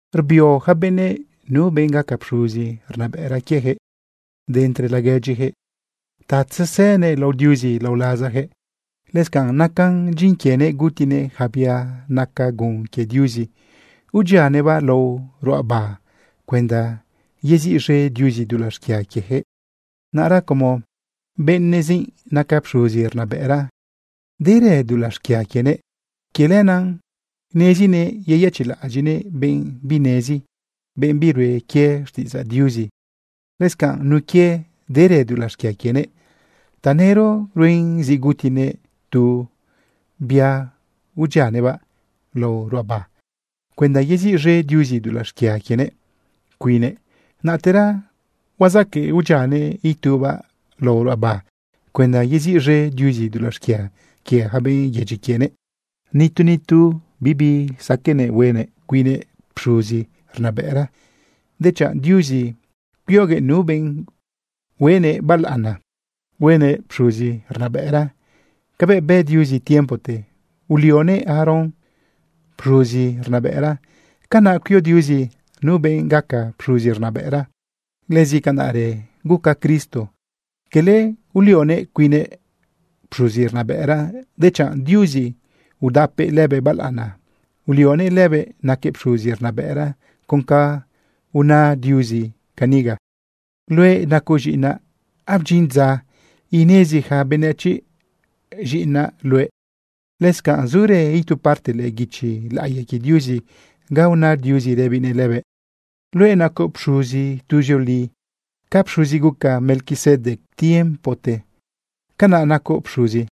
Rbio yaca benëꞌ nu benꞌ gaca pxuzi rnabëꞌra quiejëꞌ de entre laguedyijëꞌ ta tzesënëꞌ lao Diuzi lao lazajëꞌ. Lëscanꞌ nacan dyin quienëꞌ gutinëꞌ yaca bia naca gun quie Diuzi udyianëꞌbaꞌ lao ruꞌaba cuenda yeziꞌz̃e Diuzi dulaꞌ xquia quiejëꞌ. Naꞌra como benëꞌzi naca pxuzi rnabëꞌra, derë dulaꞌ xquia quienëꞌ. Quie lenaꞌ nezinëꞌ yeyëchiꞌlaꞌadyiꞌnëꞌ benꞌ binenezi, benꞌ birue quie xtiꞌidzaꞌ Diuzi. Lëscanꞌ nun quie derë dulaꞌ xquia quienëꞌ, tanëro ruen zi gutinëꞌ tu bia udyianëꞌbaꞌ lao ruꞌaba cuenda yeziꞌz̃e Diuzi dulaꞌ xquia quienëꞌ cuinnëꞌ, naꞌtera huazaquëꞌ udyianëꞌ itubaꞌ lao ruꞌaba cuenda yeziꞌz̃e Diuzi dulaꞌ xquia quie ja benꞌ yedyi quienëꞌ. Nitu nitu bisaqueꞌnëꞌ huenëꞌ cuinnëꞌ pxuzi rnabëꞌra. Dechanꞌ Diuzi cuioguëꞌ nu benꞌ huenëꞌ balaꞌana, huenëꞌ pxuzi rnabëꞌra. Cabëꞌ bë Diuzi tiempote ulioguëꞌ Aarón pxuzi rnabëꞌra, canaꞌ cuio Diuzi nu benꞌ gaca pxuzi rnabëꞌra. Lëscanaꞌrë guca quie Cristo. Quele ulionëꞌ cuinnëꞌ pxuzi rnabëꞌra, dechanꞌ Diuzi udapëꞌ lëbëꞌ balaꞌana, ulionëꞌ lëbëꞌ naquëꞌ pxuzi rnabëꞌra con ca una Diuzi caniga: Luëꞌ nacoꞌ z̃iꞌinaꞌ, abdyin dza inezi ja benëchiꞌ z̃iꞌinaꞌ luëꞌ. Lëscanꞌ zurë itu parte lëꞌë guichi laꞌiya quie Diuzi ga una Diuzi rëbinëꞌ lëbëꞌ: Luëꞌ nacoꞌ pxuzi tuzioli, ca pxuzi guca Melquisedec tiempote, canaꞌ nacoꞌ pxuzi.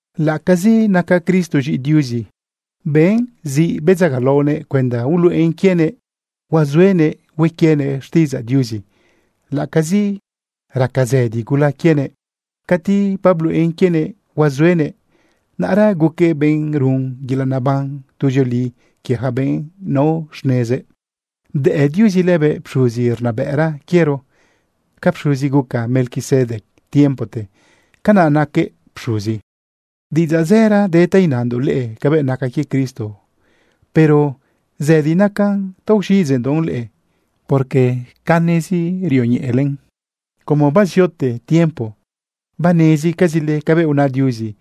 Laꞌacazi naca Cristo z̃iꞌi Diuzi, ben zi bedzagalaonëꞌ cuenda uluꞌen quienëꞌ huazuenëꞌ hue quienëꞌ xtiꞌidzaꞌ Diuzi laꞌacazi raca zëdi gula quienëꞌ. Cati babluꞌen quienëꞌ huazuenëꞌ, naꞌra guquëꞌ benꞌ run yelaꞌ neban tuzioli quie ja benꞌ nao xnezëꞌ. Bdëꞌ Diuzi lëbëꞌ pxuzi rnabëꞌra quiero. Ca pxuzi guca Melquisedec tiempote, canaꞌ naquëꞌ pxuzi. Diꞌidzaꞌ zëra de ta inandoꞌ leꞌe cabëꞌ naca quie Cristo, pero zëdi nacan ta uxiꞌidzeꞌndoꞌ leꞌe, porque canezi rioñeꞌele. Como baziote tiempo banezcazile cabëꞌ una Diuzi,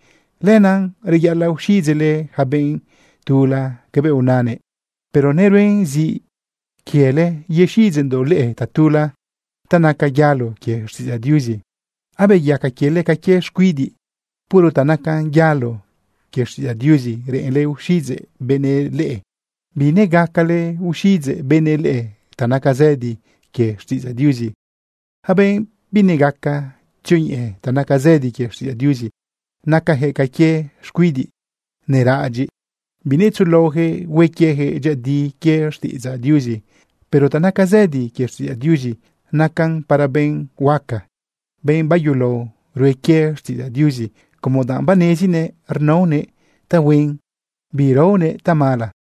lenaꞌ reyaꞌalaꞌ uxiꞌidzeꞌle yaca benꞌ tula cabëꞌ unanëꞌ. Pero neruen zi quiele yexiꞌidzeꞌndoꞌ leꞌe tatula ta nacan yalo quie xtiꞌidzaꞌ Diuzi. Abeyaca quiele ca quie xcuidiꞌ. Puro ta nacan yalo quie xtiꞌidzaꞌ Diuzi reꞌenle uxiꞌidzeꞌ benëꞌ leꞌe. Binegacale uxiꞌidzeꞌ benëꞌ leꞌe ta naca zëdi quie xtiꞌidzaꞌ Diuzi. Yaca benꞌ binegaca tzioñeꞌe ta naca zëdi quie xtiꞌidzaꞌ Diuzi, nacajëꞌ ca quie xcuidiꞌ neraꞌadyiꞌ. Binetzuꞌulaojëꞌ hue quieyaquëꞌ dyëꞌëdi quie xtiꞌidzaꞌ Diuzi. Pero ta naca zëdi quie xtiꞌidzaꞌ Diuzi, nacan para benꞌ huaca, benꞌ bayulao rue quie xtiꞌidzaꞌ Diuzi, como danꞌ banezinëꞌ rnaonëꞌ tahuen, birnaonëꞌ tamala.